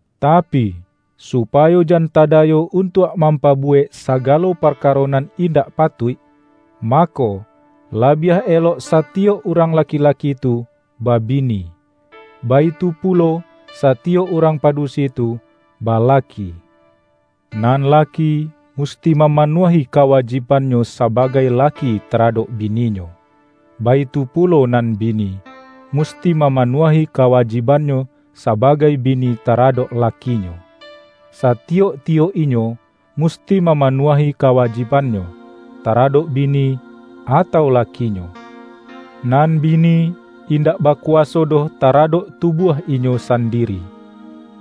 Tapi, supayo jan tadayo untuak mampabu-wek sagalo parkaro nan indak patuik, mako, labiah elok satiyok urang la-ki-laki tu, babini, baitu pulo, satiyok urang padusi tu, balaki. Nan laki, musti mamanuahi kawajibannyo sa-bagai laki taradok bininyo, baitu pulo nan bini, musti mamanuahi kawa-jibannyo sabagai bini taradok lakinyo; satiyok-tiyok inyo musti mamanuahi kawajibannyo, taradok bini, atau laki-nyo. Nan bini, indak bakuwaso doh taradok tubuah inyo sandiri;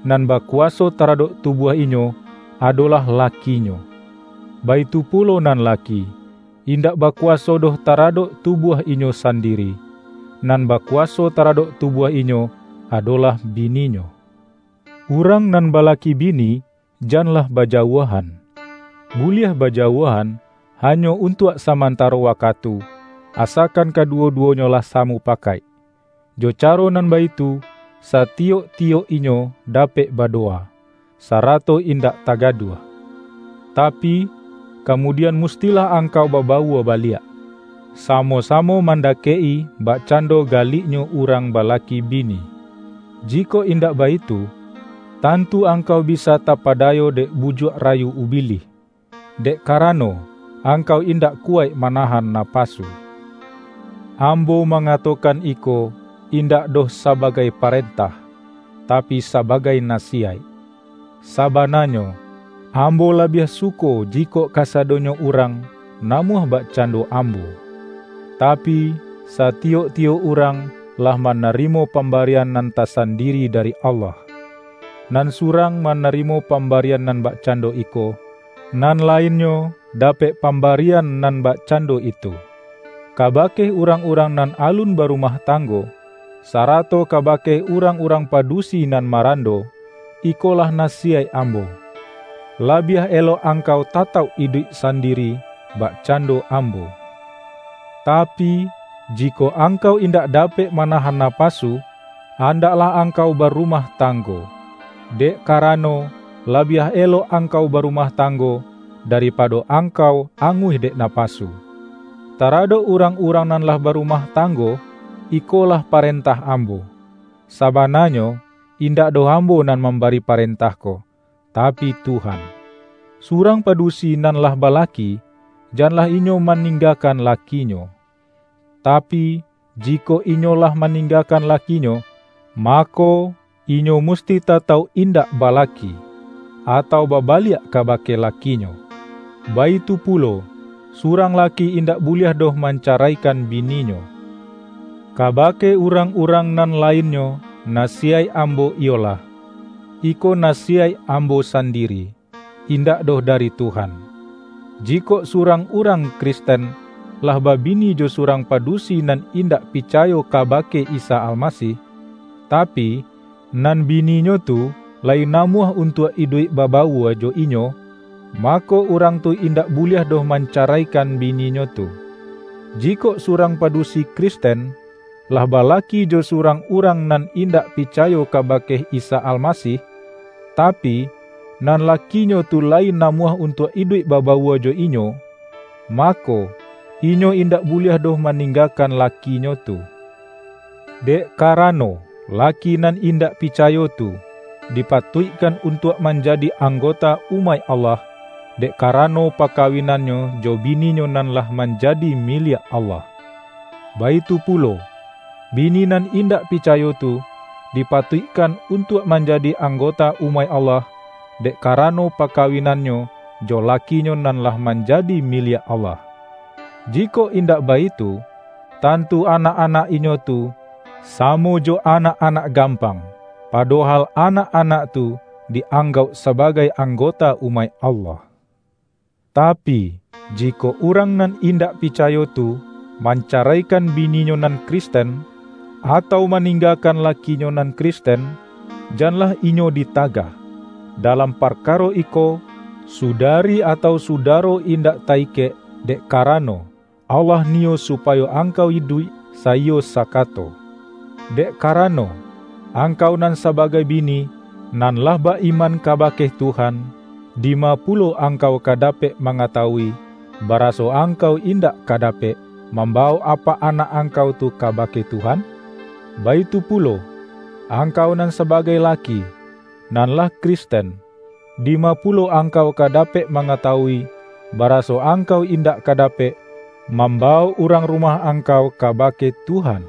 nan ba-kuwaso taradok tubuah inyo, adolah lakinyo. Baitu pulo nan laki, indak ba-kuwaso doh taradok tubuah inyo sandi-ri; nan bakuwaso taradok tubuah inyo, adolah bininyo. Urang nan balaki bi-ni, janlah bajauahan. Buliah bajauah-an hanyo untuak samantaro wakatu, asakan kaduwo-duwonyo lah samu-pakaik. Jo caro nan baitu, satiyok-ti-yok inyo dapek badowa, sarato indak tagaduah. Tapi, kamudian mustilah angkau babawua baliak, samo-samo mandakek-i bakcando galiknyo urang balaki bini. Jikok indak baitu, tantu angkau bisa tapadayo dek bujuak ra-yu ubilih, dek karano, angkau indak kuwaik manahan napasu. Ambo mangatokan iko, indak doh sabagai parentah, tapi sabagai nasi-yaik. Sabananyo, ambo labiah suko jikok kasadonyo urang, namuah bak-cando ambo. Tapi, satiyok-tiyok urang lah manarimo pambarian nan tasan-diri dari Allah. Nan surang manari-mo pambarian nan bakcando iko, nan lainnyo, dapek pambarian nan bak-cando itu. Kabake urang-urang nan alun ba-rumah tanggo, sarato kabake urang-urang padusi nan marando, ikolah nasiyaik ambo: Labiah elok angkau tatauk iduik sandiri, bakcando am-bo. Tapi, jikok angkau indak dapek manahan napasu, andaklah angkau barumah tanggo. Dek karano, labiah elok angkau barumah tanggo, da-ripado angkau anguih dek napasu. Taradok urang-urang nan lah ba-rumah tanggo, ikolah parentah am-bo: (Sabananyo, indak doh ambo nan mambari parentah ko, tapi Tuhan.) Surang padusi nan lah balaki, janlah inyo maninggakan lakinyo. Tapi, jikok inyo lah maninggakan lakinyo, mako, inyo musti tatauk indak balaki, atau babaliak kabake lakinyo. Baitu pulo, surang laki indak buliah doh mancaraikan bininyo. Kabake urang-urang nan lainnyo, nasiyaik ambo iyolah: - iko nasiyaik ambo sandiri, indak doh dari Tuhan - jikok surang urang Kristen, lah ba-bini jo surang padusi nan indak pica-yo kabake Isa Almasih, tapi, nan bi-ninyo tu layi namuah untuak iduik babawua jo inyo, mako, urang tu in-dak buliah doh mancaraikan bininyo tu. Jikok surang padusi Kristen, lah balaki jo surang urang nan indak pi-cayo kabake Isa Almasih, tapi, nan lakinyo tu layi namuah untuak iduik babawua jo inyo, mako, inyo indak buliah doh maninggakan lakinyo tu. Dek karano, laki nan indak picayo tu, dipatuikkan untuak manjadi ang-gota umaik Allah, dek karano paka-winannyo jo bininyo nan lah manja-di miliak Allah. Baitu pulo, bini nan indak picayo tu, dipatuikkan untuak manjadi anggota umaik Allah, dek karano pakawinannyo jo lakinyo nan lah manjadi miliak Allah. Jikok indak baitu, tantu anak-anak inyo tu samo jo anak-anak gampang, padohal anak-anak tu di-anggauk sabagai anggota umaik Allah. Tapi, jikok urang nan indak picayo tu, mancaraikan bininyo nan Kristen, atau maninggakan laki-nyo nan Kristen, janlah inyo ditagah. Dalam parkaro iko, sudari atau suda-ro indak ta-ikek, dek karano, Allah niyo supayo angkau iduik saiyo sa-kato. Dek karano, angkau nan sa-bagai bini - nan lah ba-iman kabake Tuhan - dima pulo angkau ka dapek mangatawui, baraso angkau indak ka dapek, mambawok apak anak angkau tu kabake Tuhan? Baitu pulo, angkau nan sabagai laki, nan lah Kristen, di-ma pulo angkau ka dapek mangata-wui, baraso angkau indak ka dapek, mambawok urang rumah angkau ka-bake Tuhan?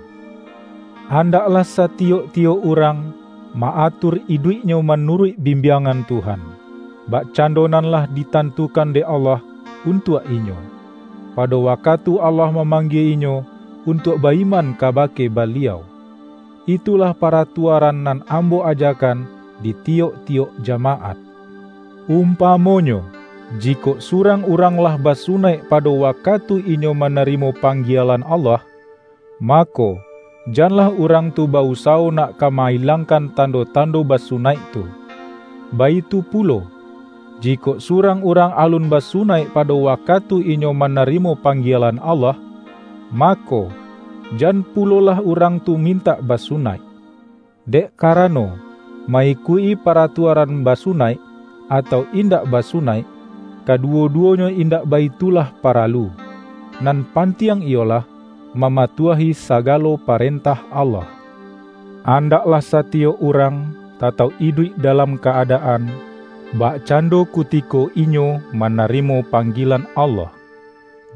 Andaklah satiyok-tiyok urang, ma-atur iduiknyo manuruik bimbiangan Tuhan, bakcando nan lah ditantukan dek Allah untuak inyo, pado waka-tu Allah mamanggie inyo untuak ba-iman kabake Baliau. Itulah paratua-ran nan ambo ajakan di tiyok-tiyok jamaat. Umpamonyo, jikok surang urang lah basunaik pado wakatu inyo manarimo panggielan Allah, mako, janlah urang tu ba-usawo nak ka ma-ilangkan tando-tando basunaik tu. Baitu pulo, jikok surang urang alun basunaik pado wakatu inyo manari-mo panggielan Allah, mako, jan pulo-lah urang tu mintak basunaik. Dek karano, ma-ikuik-i paratuaran basu-naik, atau indak basunaik, kaduwo-duwonyo indak baitulah paralu. Nan pantiang iyolah, mamatuahi sagalo parentah Allah. Andaklah satiyok urang, tatauk iduik dalam ka-adaan, bakcando kutiko inyo manarimo pang-gielan Allah.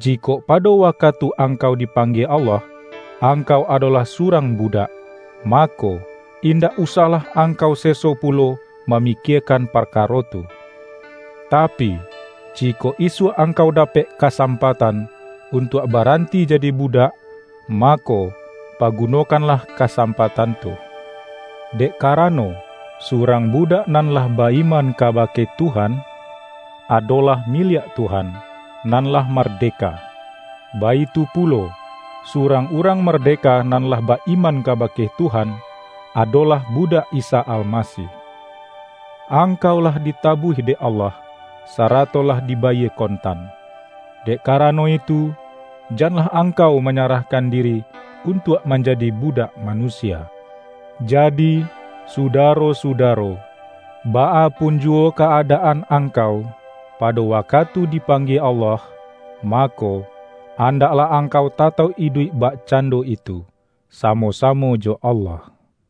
Jikok pado wakatu ang-kau dipanggie Allah, angkau adolah surang budak, mako, indak usahlah angkau seso pulo mamikiekan par-karo tu. Tapi, jikok isuak angkau da-pek kasampatan, untuak baranti jadi budak, mako, pagunokanlah kasam-patan tu. Dek karano, surang bu-dak nan lah ba-iman kabake Tuhan, adolah miliak Tuhan, nan lah marde-ka. Baitu pulo, surang urang mardeka nan lah ba-iman kabake Tuhan, ado-lah budak Isa Almasih. Angkau lah ditabuih dek Allah, sarato lah dibayie kontan. Dek karano itu, janlah ang-kau manyarahkan diri untuak manja-di budak manusia. Jadi, sudaro-su-daro, baa pun juwo ka-adaan angkau, pado wakatu dipanggie Allah, mako, andaklah angkau tatauk iduik bakcan-do itu, samo-samo jo Allah.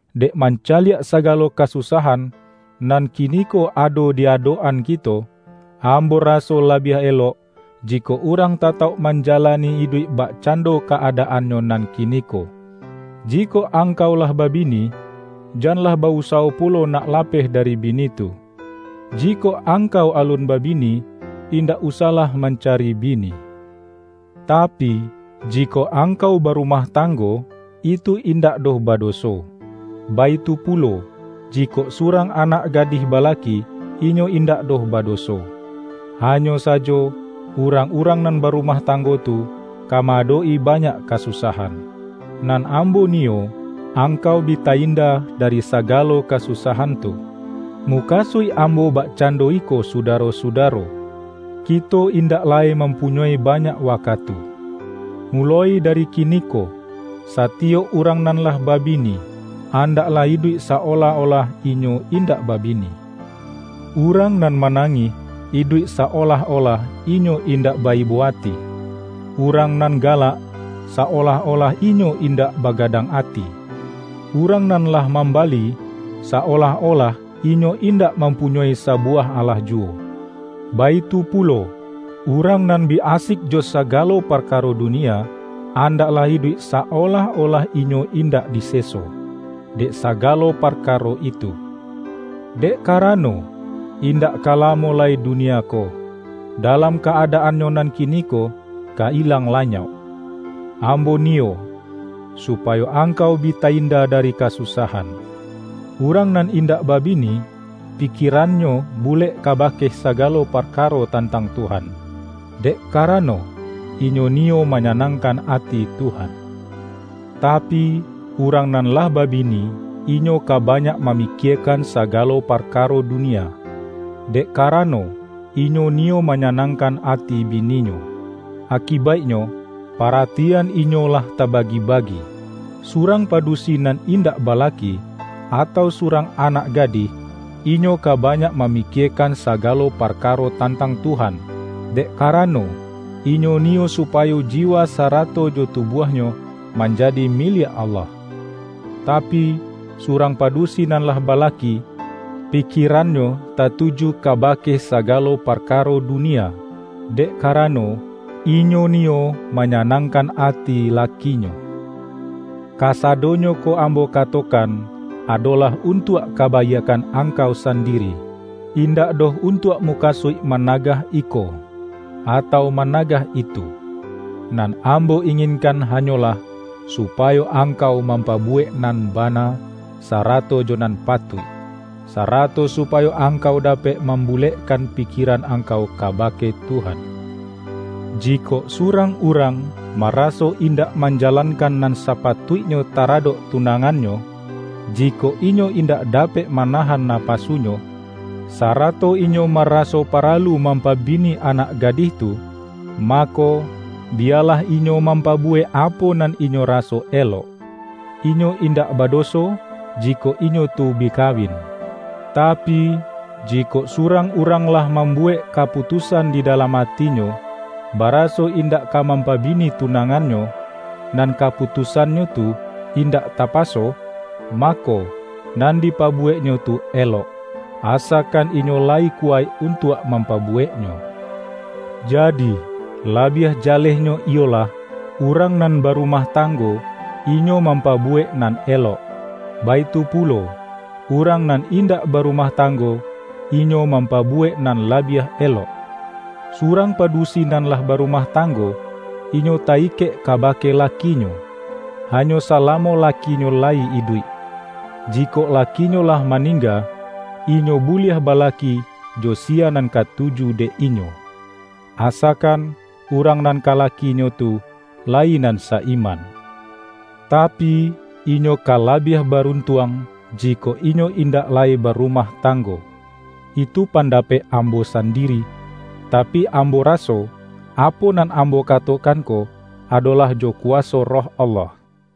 Dek mancaliak sagalo kasusah-an, nan kiniko ado di adok-an kito, ambo raso labiah elok, jikok urang tatauk manjalani iduik bakcando ka-adaannyo nan kiniko. Jikok angkau lah babini, janlah ba-usawo pulo nak lapeh dari bini tu. Jikok angkau alun babini, indak usahlah mancari bini. Tapi, jikok angkau barumah tang-go, itu indak doh badoso. Baitu pulo, jikok surang anak gadih balaki, inyo indak doh badoso. Hanyo sajo, urang-urang nan barumah tanggo tu, ka ma-adok-i banyak kasusahan. Nan ambo niyo, angkau bi ta-inda dari sagalo kasusahan tu. Mukasuik ambo bakcando iko su-daro-sudaro: Kito indak lai mampunyoi banyak wakatu. Muloi dari kiniko, sa-tiyok urang nan lah babini, andaklah iduik sa-olah-olah inyo indak babini; urang nan manangih, iduik sa-olah-olah inyo indak ba-ibo ati; urang nan galak, sa-olah-olah inyo indak baga-dang ati; urang nan lah mambali, sa-olah-olah inyo indak mampunyoi sa-buwah alah juwo; baitu pulo, urang nan bi asik jo sagalo parkaro dunia, andaklah iduik sa-olah-olah inyo in-dak diseso, dek sagalo parkaro itu. Dek karano, indak ka lamo lai dunia ko, dalam ka-adaannyo nan kiniko, ka ilang lanyok! Ambo niyo, supayo angkau bi ta-inda dari kasusahan. Urang nan in-dak babini, pikierannyo bulek kaba-ke sagalo parkaro tantang Tuhan, dek karano, inyo niyo manyanangkan ati Tuhan. Tapi, urang nan lah babini, inyo ka banyak mamikiekan sagalo parkaro dunia, dek karano, inyo ni-yo manyanangkan ati bininyo; aki-baiknyo, paratian inyo lah tabagi-bagi. Surang padusi nan indak balaki, atau surang anak gadih, inyo ka banyak mamikiekan sagalo parkaro tantang Tuhan, dek karano, inyo niyo supa-yo jiwa sarato jo tubuahnyo, manja-di miliak Allah. Tapi, surang padusi nan lah balaki, pikierannyo tatuju ka-bake sagalo parkaro dunia, dek kara-no, inyo niyo manyanangkan ati laki-nyo. Kasadonyo ko ambo katokan, adolah untuak kabaiakkan angkau sandiri, indak doh untuak mukasuik managah iko, atau managah itu. Nan ambo inginkan hanyolah, supayo ang-kau mampabuwek nan bana, sarato jo nan patuik, sarato supayo angkau da-pek mambulekkan pikieran angkau kabake Tuhan. Jikok surang urang, maraso indak manjalankan nan sapatuiknyo taradok tunangannyo, jikok inyo indak dapek manahan napasunyo, sarato inyo ma-raso paralu mampabini anak gadih tu, mako, biyalah inyo mampabuwek apo nan inyo raso elok. Inyo indak badoso, jikok inyo tu bi kawin. Tapi, jikok surang urang lah mambuwek kaputus-an di dalam atinyo, baraso indak ka mampabini tunangannyo, nan kapu-tusannyo tu indak tapaso, mako, nan dipabuweknyo tu elok, asakan inyo la-yi kuwaik untuak mampabuweknyo. Jadi, labiah jalehnyo iyolah, urang nan barumah tanggo, inyo mampabu-wek nan elok, baitu pulo, urang nan indak barumah tanggo, inyo mampa-buwek nan labiah elok. Surang padusi nan lah barumah tanggo, inyo ta-ikek kabake lakinyo, hanyo salamo lakinyo layi iduik. Jikok lakinyo lah maningga, inyo buliah ba-laki jo siya nan katuju dek inyo; asa-kan urang nan ka lakinyo tu, layi nan sa-iman. Tapi, inyo ka labiah barun-tuang, jikok inyo indak lai barumah tanggo. Itu pandapek ambo sandiri, tapi ambo raso, apo nan ambo katokan ko adolah jo kuwaso Roh Allah.